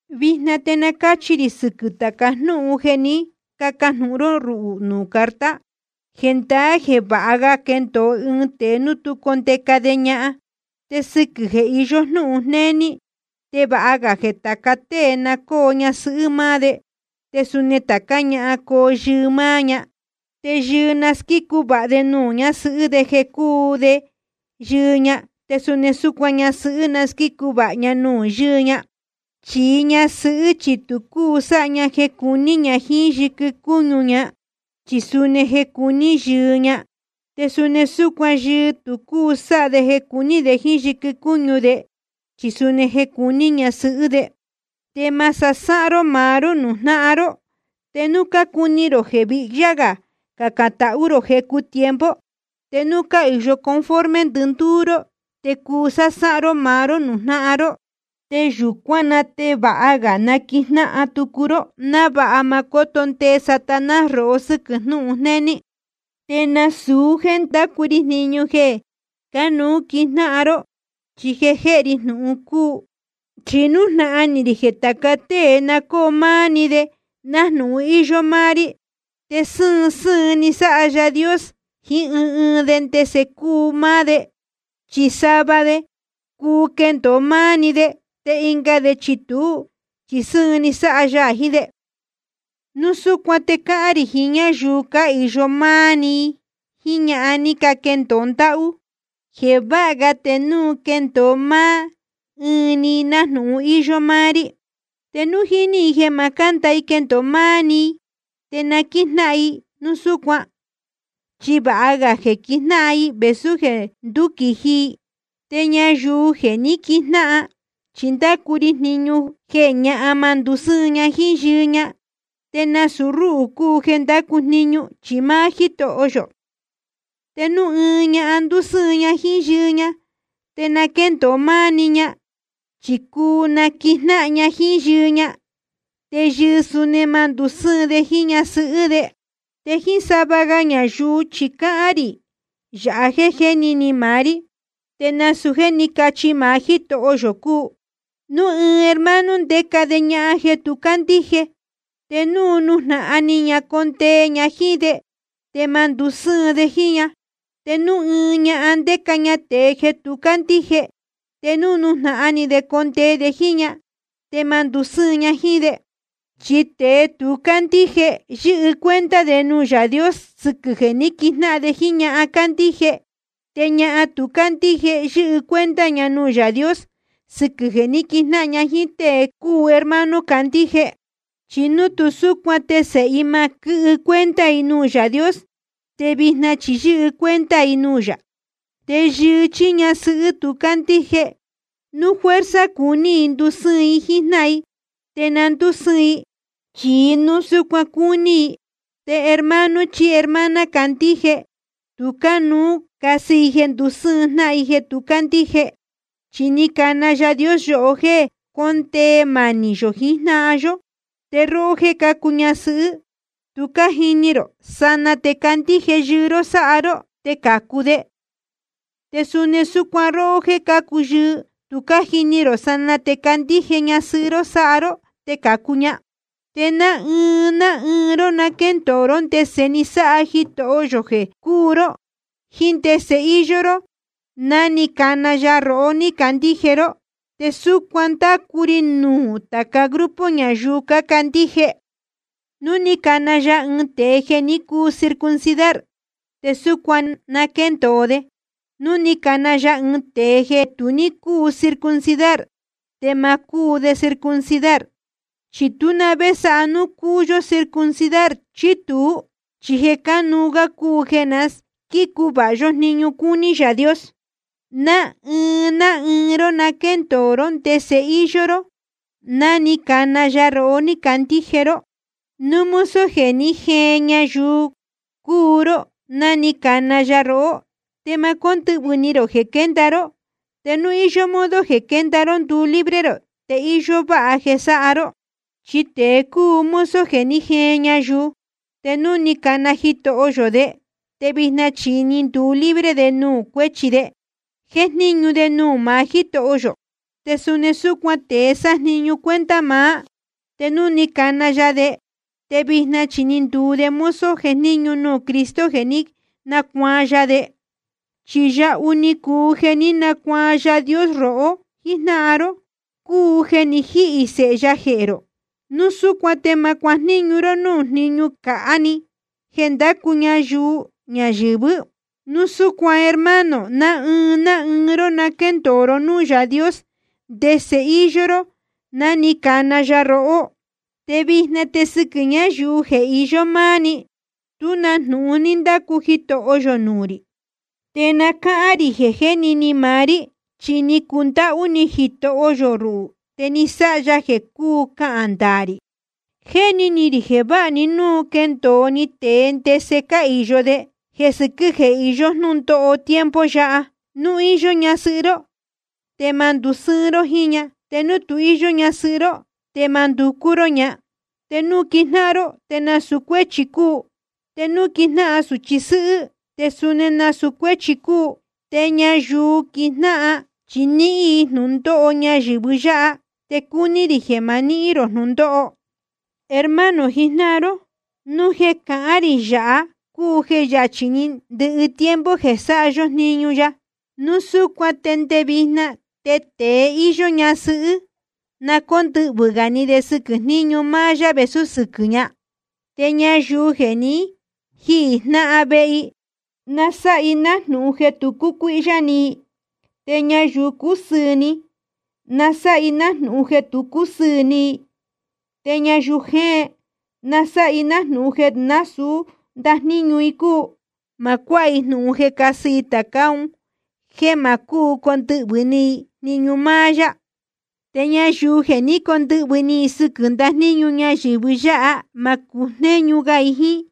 Vijna te na cáchi rī sɨquɨ̄ tāca jnúhun jeē ní cacajnūhun ró ruhū nuū carta. Jendaá jeē vāha ga quendōo ɨɨn tēe núu tú condeca de ñahan. Te sɨquɨ̄ jeē iyó jnúhun jnéní, te vāha ga jeē tāca tée na cóo ñasɨhɨ́ máá de, te suni tācá ñahan coo yɨɨ máá ña. Te yɨɨ na squícu vāha de nuū ñasɨhɨ́ de jeē cúu de yɨɨ ña. Te suni súcuan ñasɨhɨ́ na squícu vāha ña nuū yɨɨ ña. Chi ñasɨhɨ́ chi tu cúu sáha ña jeē cuní ña jíín yɨquɨ cúñu ña, chi suni jeē cuní yɨɨ ña. Te suni súcuan yɨɨ tu cúu sáha de jeē cuní de jíín yɨquɨ cúñu de, chi suni jeē cuní ñasɨhɨ́ de. Te ma sasáhán ró maá ró nuū jnáhan ró. Te núu cácuni rō jeē vihyá gā cacān tahú rō jecu tiempo, te núu cáhīyo conforme ndɨndúú ró, te cuu sásáhán ró maá ró nuū jnáhan ró. Te yūcuán na te vāha ga naquijnáhan tucu ró, návāha ma cóto ndee Satanás rohó sɨquɨ̄ jnūhun jnéní. Te nasūu jéē ndácu ri jniñu jeē cánuú quijnáhan ró, chi jeē jéhe ri jnūhun cúu. Chi nújnahan ni rī jeē tāca tée na cóo máá ɨɨn‑ni de, nájnūhun íyó máá rí. Te sɨ́ɨn sɨ́ɨn ni sáha Yaā Dios jiín ɨɨn ɨɨn de ndese cúu máá de, chi sava de cuu quendōo máá ɨɨn‑ni de, te ɨnga de chi tuú chi sɨ́ɨn ni sáha ya jiín de. Núu súcuan te cáhán rī jiín ñáyuu cáhīyo máá ɨɨn‑ni, jíín ñahan ní caquendōo ndáhú, jeē vāha ga te núu quendōo máá ɨɨn‑ni i, nájnūhun íyó máá rí. Te núu jíní i jeē ma cánda i quendōo máá ɨɨn‑ni i, te na quíjnáhan i núu súcuan. Chi vāha ga jeē quijnáhan i vēsú jeē ndúquīji i. Te nuū ñáyuu jeē jé ni quijnáhan chi ndácu ri jniñu jeē ñahan ma ndusɨ́ɨn ña jíín yɨɨ ña. Te nasūu rúhū cúu jeē ndácu jniñu, chi máá Jítoho yō. Te núu ɨɨn ñahan ndusɨ́ɨn ña jíín yɨɨ ña, te na quéndōo máá ɨɨn‑ni ña, chí cuu naquijnáhan ña jíín yɨɨ ña. Te yɨɨ suni ma ndusɨ́ɨn de jíín ñasɨhɨ́ de. Te jíín sava ga ñayuu chi cahān rī yāha jéē jéni ni maá rí, te nasūu jéē ní cachi maá Jítoho yō cúu. Núu ɨɨn hermano ndéca de ñahan jeē tu cándíje, te núu nújnahan ni ña condee ña jíín de, te ma ndusɨ́ɨn de jíín ña. Te núu ɨɨn ñahan ndéca ña tēe jeē tu cándíje, te núu nújnahan ni de condee de jíín ña, te ma ndusɨ́ɨn ña jíín de. Chi tēe tu cándíje, yɨ́hɨ cuenta de nuū Yaā Dios sɨquɨ̄ jeē ní quijnáhan de jíín ñahan cándíje. Te ñahan tu cándíje, yɨ́hɨ cuenta ña nuū Yaā Dios sɨquɨ̄ jeē ní quijnáhan ña jíín tée cúu hermano candíje. Chi núu tu súcuan te sēhe i ma quɨ́hɨ cuenta i nuū Yaā Dios, te vijna chi yɨ́hɨ cuenta i nuū yā. Te yɨɨ chí ñasɨhɨ́ tu cándíje, núu fuerza cuní i ndusɨ́ɨn i jíín jnáhan i, te na ndúsɨ́ɨn i. Chi núu súcuan cúní i, te hermano chí hermana candíje tu cánuú casɨ i jeē ndusɨ́ɨn jnáhan i jeē tu cándíje. Chi ni cana Yaā Dios yohó jéē condee manī yō jiín jnáhan yó. Te róhó jéē cácuu ñasɨhɨ́, tu cájini rō, sanaa te candíje yɨɨ ró sáha ró, te cācu de. Te suni súcuan róhó jéē cácuu yɨɨ, tu cájini rō, sanaa te candíje ñasɨhɨ́ ró sáha ró, te cācu ña. Te ná ɨɨn ná ɨɨn ró na quéndōo ró ndese ni sáha Jitoho yō jeē cúu ró, jiín ndese íyó ró ná ni cana ya rohó ní candíje ró. Te súcuan ndácu ri nuū tāca grupo ñayuu cácandíje. Núu ni cana ya ɨɨn tēe jeē ní cuu circuncidar, te súcuan na quéndōo de. Núu ni cana ya ɨɨn tēe jeē tu ní cúu circuncidar, te ma cúu de circuncidar. Chi tú na vé sáha núu cúu yó circuncidar chí tuú, chi jeē cánuú gá cúu jeē na squícu vāha yó jniñu cúní Yaā Dios. Ná ɨɨn ná ɨɨn ró na quéndōo ró ndese íyó ró ná ni cana ya rohó ní candíje ró. Núu mozo jeē ní jeen ñayuu cúu ró ná ni cana ya rohó, te ma cóndɨhvɨ̄ ni rō jeē quénda ró. Te núu íyó modo jeē quénda ró nduu libre rō, te íyó váha jeē sáha ró. Chi tēe cúu mozo jeē ní jeen ñayuu, te núu ni cana Jitoho yō de, te vijna chi ni nduu libre de nuū cuéchi de, jéjníñu de nuū maá Jítoho yō. Te suni súcuan tēe sájniñu cuenta maá, te núu ni cana ya de, te vijna chi ni nduu de mozo jejníñu nuū Cristo jeē ní nacuaan ya de. Chi yahu ni cuu jeē ní nacuaan Yaā Dios rohó jijnáhan ró, cúu jeē ni jíhī Sēhe ya jehē rō. Núu súcuan te ma cuajníñu ró núū jníñu cāhá‑ni jeē ndácu ñayuu ñayɨ̄vɨ́. Núu súcuan hermano, ná ɨɨn ná ɨɨn ró na quéndōo ró núū Yaā Dios ndese íyó ró ná ni cana ya rohó. Te vijna te sɨquɨ̄ ñayuu jeē iyó máá‑ni, tú na jnūhun ní ndácu Jitoho yō nuū rī. Te na cáhán rī jeē jéni ni maá rí, chi ni cundáhú ni Jitoho yō ruhū, te ni sáha ya jeē cúu cahān ndaā rī. Jéni ni rī jeē vāha‑ni núu quendōo‑ni tēe ndese cáhīyo de, jeē sɨquɨ́ jeē iyó jnúndóho tiempo yáha. Núu íyó ñasɨhɨ́ ró, te ma ndusɨ́ɨn ró jíín ña. Te núu tu íyó ñasɨhɨ́ ró, te ma nducú ró ña. Te núu quijnáhan ró, te nasūu cuéchi cúu. Te núu quijnáhan sūchi sɨ́hɨ́, te suni nasūu cuéchi cúu. Te ñayuu quijnáhan, chi nihīn i jnūndóho ñayɨ̄vɨ yáha, te cúní rī jeē ma nihín rō jnūndóho. Hermano jijnáhan ró, jnūhun jeē cahán rī yāha cúu jeē yachī‑ni ndɨhɨ tiempo jeē sáha yó jniñu ya. Núu súcuan te nde vijna te tēe íyó ñasɨhɨ́, na cóndɨhvɨ̄ gā ni de sɨquɨ̄ jníñu máá yá vēsú sɨquɨ̄ ña. Te ñayuu jeē ni jíhī jnáhan vehe i, na sáha i nájnūhun jeē tu cúcuíhyá ni i. Te ñayuu cúsɨɨ̄ ni, na sáha i nájnūhun jeē tu cúsɨɨ̄ ni i. Te ñayuu jéen, na sáha i nájnūhun jeē nasūú ndajníñu i cúu. Ma cuáha i jnūhun jeē cásɨ tācá un jéē ma cúu condɨhvɨ̄ ni i jniñu máá yá. Te ñayuu jeē ní cacondɨhvɨ̄ ni sɨquɨ̄ ndajníñu ñayɨ̄vɨ yáha, ma cujnéñu ga i jíín.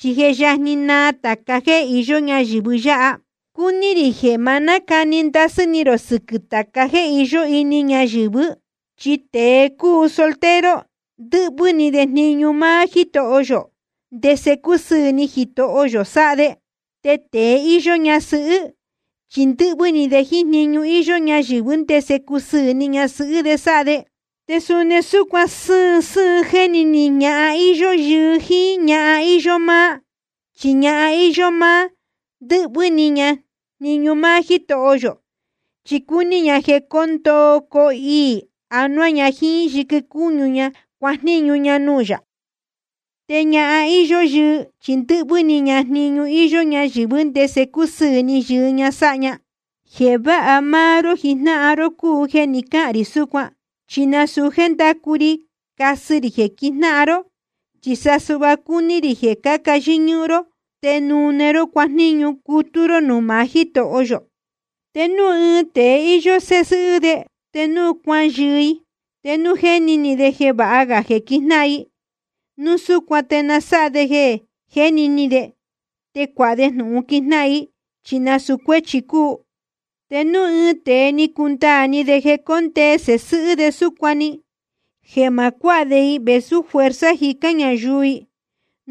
Chi je yajni naa tāca jéē iyó ñáyɨ̄vɨ yáha. Cúní rī jeē ma nácani ndasɨ́ ni rō sɨquɨ̄ tāca jéē iyó ini ñayɨ̄vɨ́. Chi tēe cúu soltero, ndɨ́hvɨ́ ni de jniñu máá Jítoho yō, ndese cusɨɨ̄ ni Jitoho yō sáha de. Te tēe íyó ñasɨhɨ́ chi ndɨ́hvɨ́ ni de jniñu íyó ñayɨ̄vɨ́, ndese cusɨɨ̄ ni ñasɨhɨ́ de sáha de. Te suni súcuan sɨ́ɨn sɨ́ɨn jéni ni ñahan íyó yɨɨ jíín ñahan íyó máá. Chi ñahan íyó máá, ndɨ́hvɨ́ ni ña jniñu máá Jítoho yō, chi cúní ña jeē coo ndoo coo iī anuá ña jíín yɨquɨ cúñu ña cuajníñu ña nuū yā. Te ñahan íyó yɨɨ chi ndɨ́hvɨ́ ni ña jniñu íyó ñayɨ̄vɨ́, ndese cusɨɨ̄ ni yɨɨ ña sáha ña. Jeē váha máá ró jijnáhan ró cúu jeē ni cáhān rī súcuan. Chi nasūu jéē nducú rí casɨ rī jeē quijnáhan ró, chi sa suhva cúní rī jeē caca yɨ́ñúhún ró te nune ró cuajníñu cutú ró núū maá Jítoho yō. Te núu ɨɨn tēe íyó sēhe sɨ́hɨ́ de, te núu cuayɨɨ i, te núu jéni ni de jeē vāha ga jeē quijnáhan i, núu súcuan te na sáha de jeē jéni ni de, te cuāha de jnūhun quijnáhan i, chi nasūu cuéchi cúu. Te núu ɨɨn tēe ni cundaā ni de jeē cóndee sēhe sɨ́hɨ́ de súcuan‑ni, jeē ma cuáha de i vēsú fuerza jícán ñayuu i,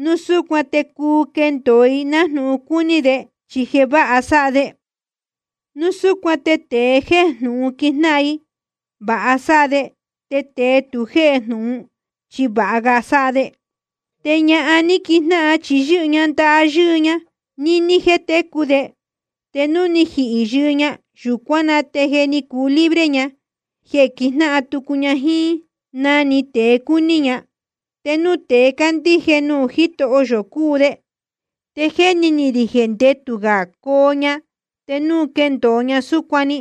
núu súcuan te cuu quendōo i nájnūhun cúní de, chi jeē váha sáha de. Núu súcuan te tēe jéhe jnūhun quijnáhan i, vāha sáha de. Te tēe tu jéhe jnūhun, chi vāha ga sáha de. Te ñahan ní quijnáhan, chi yɨ́hɨ ña ndaha yɨ́ɨ ña níní jeē técu de. Te núu je ni jihī yɨɨ ña, yūcuán na te je ni cuu libre ña jeē quijnáhan tucu ña jíín na‑ni tēe cúu ni ña, te núu tēe cándíje nuū Jítoho yō cúu de. Te jéni ni rī jeē ndetū gā coo ña te núu quendōo ña súcuan‑ni.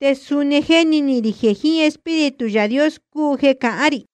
Te suni jéni ni rī jeē jiín Espíritu Yaā Dios cúu jeē cahán rī.